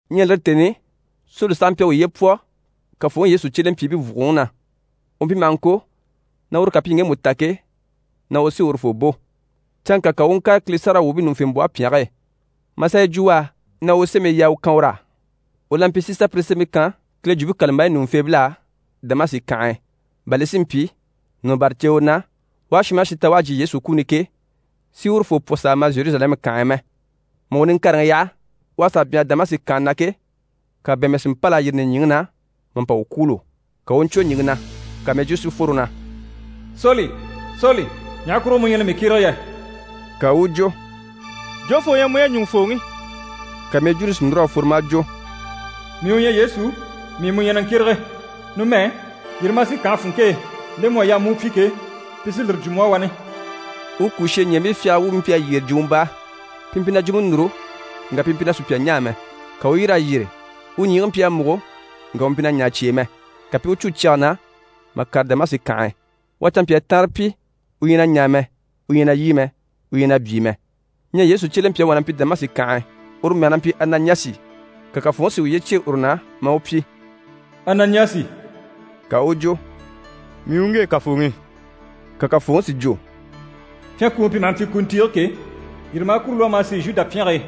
Ɲyɛ lire tèni i Soli saha mpyi a uye pwɔ Kafooŋi Yesu cyelempyiibii vùguroŋi na. U mpyi maha ŋko na uru ká pi ŋgemu ta ke, na uru sí urufoo bò. Canŋka ka u u ŋkàre Kile sáragawwuubii ɲùŋufembwɔhe pyɛnge e, maa sà yi jwo u á na u sémii yaa u kan ur'á. U la mpyi si sà pire sémɛbii kan Kile Jwumpe kàlambayi ɲùŋufeebil'á Damasi kànhe e, bà li si mpyi, nɔ̀ bâra ceewe na, u aha shin maha shin ta u à jyè Yesu kuni i ke, si urufoo pwɔ s'a ma Zheruzalɛmu kànhe e mɛ. Mà u niŋkareŋi yaha, u à sà byanhara Damasi kànhe na ke, ka bɛ̀ɛnmɛ si mpâl'a yîri nìɲyiŋi na mà pa u kwûulo. Ka u u ɲcwo ɲìŋke na, ka mɛjwuu si fworo na: «Soli, Soli, ɲaha kurugo mu ɲyɛ na mii kyérege yɛ?» Ka u u jwo: «Jofoo u ɲyɛ mu yɛ, ɲùŋufooŋi?» Ka mɛjwuuni si núr'a fworo maa jwo: «Mii u ɲyɛ Yesu, mii mu ɲyɛ na ŋkyérege. Numɛ, yîri ma a sì kànhe funŋke e, nde mu à yaa mu u pyi ke, pi sí lire jwo mu á wani.» U kùsheɲɛɛbii fyagara wuubii mpyi a yyére jwumɔ baa, pi mpyi na jwumpe núru, ŋka pi mpyi na sùpya ɲaa mɛ. Ka u u yîr'a yyére, u ɲyiigii mpyi a múgo, ŋka u mpyi na ɲaa cyi e mɛ, ka pi i u cû cyɛge na mà kàre Damasi kànhe e. U à canmpyaa taanre pyi, u ɲyɛ na ɲaa mɛ, u ɲyɛ na lyî mɛ, u ɲyɛ na byii mɛ. Ɲyɛ Yesu cyelempyaŋi wà na mpyi Damasi kànhe e, uru mɛge na mpyi Ananiyasi, ka Kafooŋi si uye cyêe uru na maa u pyi: «Ananiyasi!» ka u u jwo: «Mii u ŋge, Kafooŋi.» Ka Kafooŋi si jwo: «Pyɛnkuuŋi pi maha mpyi kuntiige ke, yîri ma a kuru lwɔ́, ma a sì Zhuda pyɛnge e.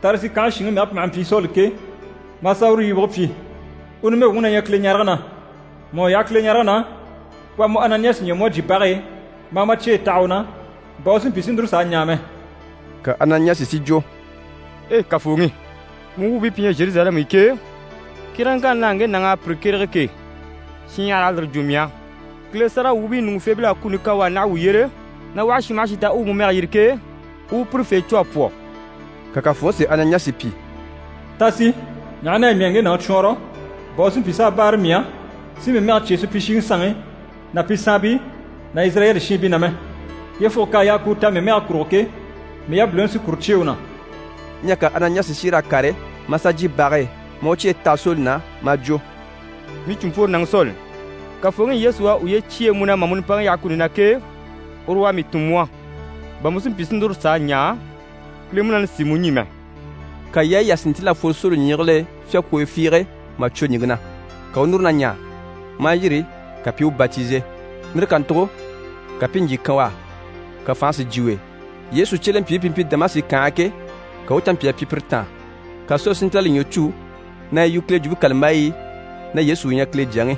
Tarisi kànhe shinŋi mɛge pi maha mpyi Soli ke, ma a sà uru yibige pyi. U numɛ wuŋi na ɲyɛ Kileɲarege na. Mà u yaha Kileɲarege na, u à mu Ananiyasi ɲya, mu à jyè bage e, ma a ma cyeyi taha u na, bà u si mpyi si núru s'a ɲaa mɛ.» Ka Ananiyasi si jwo: «Ei Kafooŋi! Mu wuubii pi ɲyɛ Zheruzalɛmu i ke, kyéregeŋkanni na ŋge nàŋ'à pire kyérege ke, shinɲyahara à lire jwo mii á. Kile sáragawwuubii ɲùŋufeebil'à kuni kan u á naha wuu yyére, na u aha shin maha shin ta u u mu mɛge yiri ke, u u pirefee cû a pwɔ.» Ka Kafooŋi si Ananiyasi pyi: «Ta sì, ɲaha na yɛ mii à ŋge nàŋi cwɔɔnrɔ, bà u si mpyi s'a báare mii á, si mii mɛge cyêe supyishiŋi sanŋi ná pi saanbii ná Izirayɛli shiinbii na mɛ. Yyefuge k'à yaa ku u ta mii mɛge kurugo ke, mii yabiliŋi sí kuru cyêe u na.» Ɲyɛ ka Ananiyasi si yîr'a kàre, maa sà jyè bage e, maa u cyeyi taha Soli na, maa jwo: «Mii cìnmpworonaŋi Soli, Kafooŋi Yesu u à uye cyêe mu na mà mu nimpaŋi yaha kuni na ke, uru u à mii tun mu á, bà mu si mpyi si núru s'a ɲaa, Kile Munaani si mu ɲî mɛ.» Ka yaayi yà si ntíl'a fworo Soli ɲyiigil'e fyákwooyo fiige, mà cwo ɲìŋke na. Ka u u núru na ɲaa, maa yîri, ka pi i u batize. Lire kàntugo ka pi i ɲjyì kan u á, ka fànhe si jyè u e. Yesu cyelempyiibii pi mpyi Damasi kànhe e ke, ka u u canmpyaa pyi pire taan. Ka Soli si ntíl'a li ɲwɔ cû na yi yu Kile Jwumpe kàlambayi i, na Yesu u ɲyɛ Kile Jyaŋi.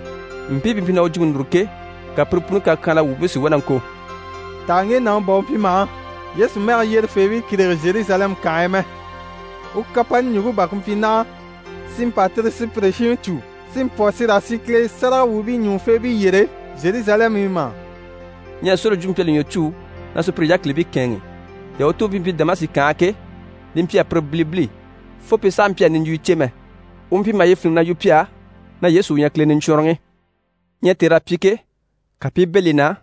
Mpii pi mpyi na u jwumpe núru ke, ka pire puni kakyanhala wuubii si wá na ŋko: «Taha ŋge nàŋi bà u mpyi maha Yesu mɛge yyerefeebii kyérege Zheruzalɛmu kànhe e mɛ? U kapani ɲùŋke bà ku mpyi naha, si mpa tire sùpyire shiŋi cû si pi pwɔ si raa sì Kile sáragawwuubii ɲùŋufeebii yyére Zheruzalɛmu i mà?» Ɲyɛ Soli jwumpe mpyi a li ɲwɔ cû na sùpyire yákilibii kɛ̂ɛnŋi. Yahutuubii pi mpyi Damasi kànhe e ke, li mpyi a pire bilibili, fo pi sàha mpyi a niɲjwuyo cè mɛ, u mpyi maha yi fíniŋi na yu pi á na Yesu u ɲyɛ Kile Niɲcwɔnrɔŋi. Ɲyɛ tèr'à pyi ke, ka pi i bɛ̂ li na,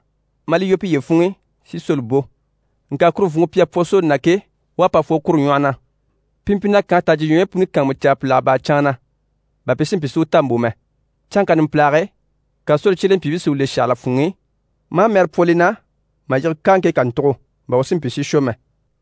maa li lwɔ́ piye funŋ'i si Soli bò. Ŋka kuru vùnŋke pi à pwɔ Soli na ke, u à pa fworo kuru ɲwɔhɔ na. Pi mpyi na kànhe tajyiɲwɔyi puni kàanmucaa pìlaga bâra canŋa na, bà pi si mpyi si u ta mbò mɛ. Canŋka numpilage e, ka Soli cyelempyiibii si u le shàhala funŋ'i, maa mɛɛre pwɔ li na mà yige káaŋke kàntugo, bà u si mpyi si shwɔ mɛ.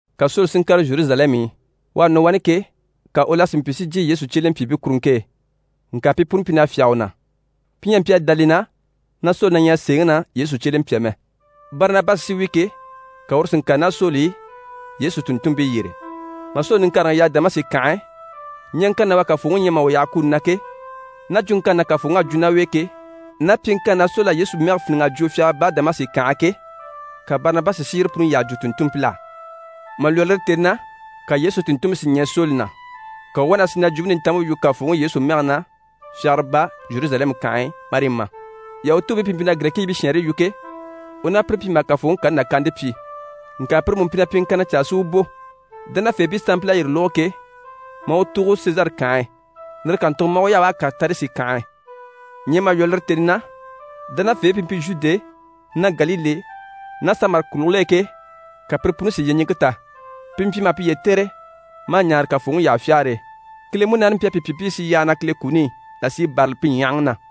Ka Soli si ŋkàre Zheruzalɛmu i. U à nɔ wani ke, ka u la si mpyi si jyè Yesu cyelempyiibii kuruŋke e, ŋka pi puni mpyi na fyáge u na. Pi ɲyɛ a mpyi a dá li na na Soli na ɲyɛ sèeŋi na Yesu cyelempya mɛ. Barinabasi sí wi ke, ka uru si ŋkàre ná Soli i Yesu tùnntunmpii yyére. Mà Soli niŋkareŋi yaha Damasi kànhe e, ɲyaŋkanni na u à Kafooŋi ɲya mà u yaha kuni na ke, ná jwuŋkanni na Kafooŋi à jwo ná u e ke, ná pyiŋkanni na Soli à Yesu mɛge fíniŋ'a jwo fyagara baa Damasi kànhe e ke, ka Barinabasi si yire puni yyaha jwo tùnntunmpil'á. Mà lwɔ́ lire tèni na, ka Yesu tùnntunmpii si ɲɛɛ Soli na, ka u u wá na sì na Jwumpe Nintanmpe yu Kafooŋi Yesu mɛge na fyagara baa Zheruzalɛmu kànhe e, marii ma. Yahutuubii pi mpyi na Girɛkiibii shɛɛnre yu ke, u ná pire mpyi maha Kafooŋi kani nàkaante pyi, ŋka pire mú mpyi na pyiŋkanna caa si u bò. Dánafeebii sanmpil'à yire lógo ke, maa u tùugo Sezare kànhe e. Lire kàntugo maa u yaha u à kàre Tarisi kànhe e. Ɲyɛ mà lwɔ́ lire tèni na, dánafeebii pi mpyi Zhude ná Galile ná Samari kùligil'e ke, ka pire puni si yyeɲiŋke ta. Pi mpyi maha piye tɛ̀re, maa ɲaare Kafooŋi yyahafyagare e. Kile Munaani mpyi a pi pyi pi i sì yyaha na Kile kuni i, là sí i bârali pi ɲyahaŋi na.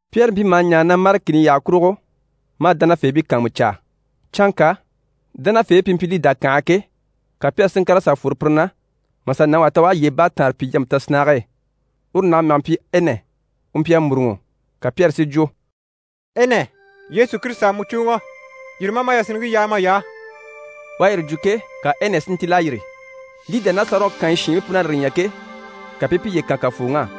Pyɛri mpyi maha ɲaare na mâre kìni yyaha kurugo, maa dánafeebii kàanmucaa. Canŋka dánafeebii pi mpyi Lida kànhe e ke, ka Pyɛri si ŋkàr'a sà fworo pire na, mà sà nàŋi wà ta u à yyee baataanre pyi yampe tasinnage e. Uru nàŋi mɛge mpyi Ɛnɛ. U mpyi a mûruŋɔ. Ka Pyɛri si jwo: «Ɛnɛ, Yesu Kirisita à mu cùuŋɔ, yîri ma a ma yasinniŋke yaa may'á.» U à yire jwo ke, ka Ɛnɛ si ntíl'a yîri. Lida ná Sarɔn kànyi shiinbii pun'à lire ɲya ke, ka pi i piye kan Kafooŋi á.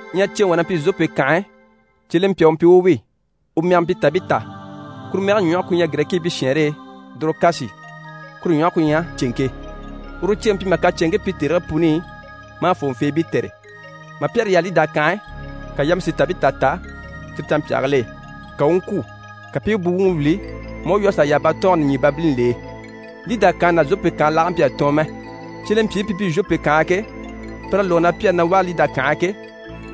Ɲyɛ ceeŋi wà na mpyi Zhope kànhe e, cyelempya u mpyi u wi, u mɛge mpyi Tabita. Kuru mɛge ku ɲyɛ Girɛkiibii shɛɛnre e: «Dorokasi» kuru ɲwɔhe ku ɲyɛ: «Ceŋke». Uru ceeŋi mpyi maha kacɛnŋkii pyi tèrigii puni i, maa fòŋɔfeebii tɛ̀re. Mà Pyɛri yaha Lida kànhe e, ka yama si Tabita ta cyire canmpyaagil'e, ka u u ŋkwû. Ka pi i u buwuŋi wìli, maa u lwɔ́ a sà yaha batɔɔnge nìɲyibabilini l'e. Lida kànhe ná Zhope kànhe laage mpyi a tɔɔn mɛ. Cyelempyiibii pi mpyi Zhope kànhe e ke, pir'à lógo na Pyɛri na ɲyɛ Lida kànhe e ke,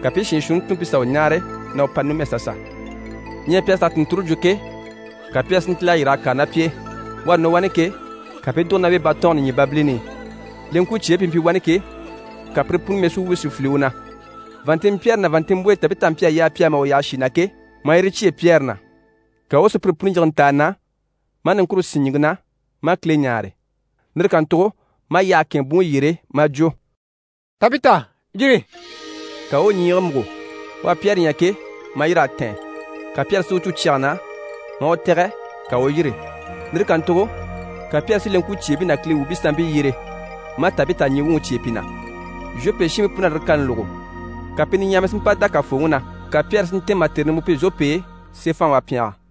ka pi i shiin shuunni tun pi sà u ɲáare, na u pa numɛ sasa. Ɲyɛ pi à sà tùnnture jwo ke, ka Pyɛri si ntíl'a yîr'a kàre ná pi e. U à nɔ wani ke, ka pi i dùgo ná u e batɔɔnge nìɲyibabilini i. Leŋkwucyeebii pi mpyi wani ke, ka pire puni mɛsuwuubii si file u na. Vàanntinmpyɛɛre ná vàanntinmbwoyi Tabita mpyi a yaa pi á mà u yaha shì na ke, maa yire cyêe Pyɛri na. Ka u u sùpyire puni yige ntàani na, maa niŋkure sín ɲìŋke na, maa Kile ɲáare. Lire kàntugo maa yyahe kɛ̂ɛnŋɛ buŋi yyére maa jwo: «Tabita, yîri!» Ka u u ɲyiigii múgo. U à Pyɛri ɲya ke, maa yîr'a tɛ̀ɛn. Ka Pyɛri si u cû cyɛge na, maa u tɛ̀gɛ, ka u u yîri. Lire kàntugo ka Pyɛri si leŋkwucyeebii ná Kile wuubii sanmpii yyere, maa Tabita ɲyii wuŋi cyêe pi na. Zhope shiinbii pun'à lire kani lógo. Ka pi niɲyahamii si mpa dá Kafooŋi na. Ka Pyɛri si ntɛ̀ɛn mà tère nimbwoo pyi Zhope e, seefanhaŋi wà pyɛngɛ.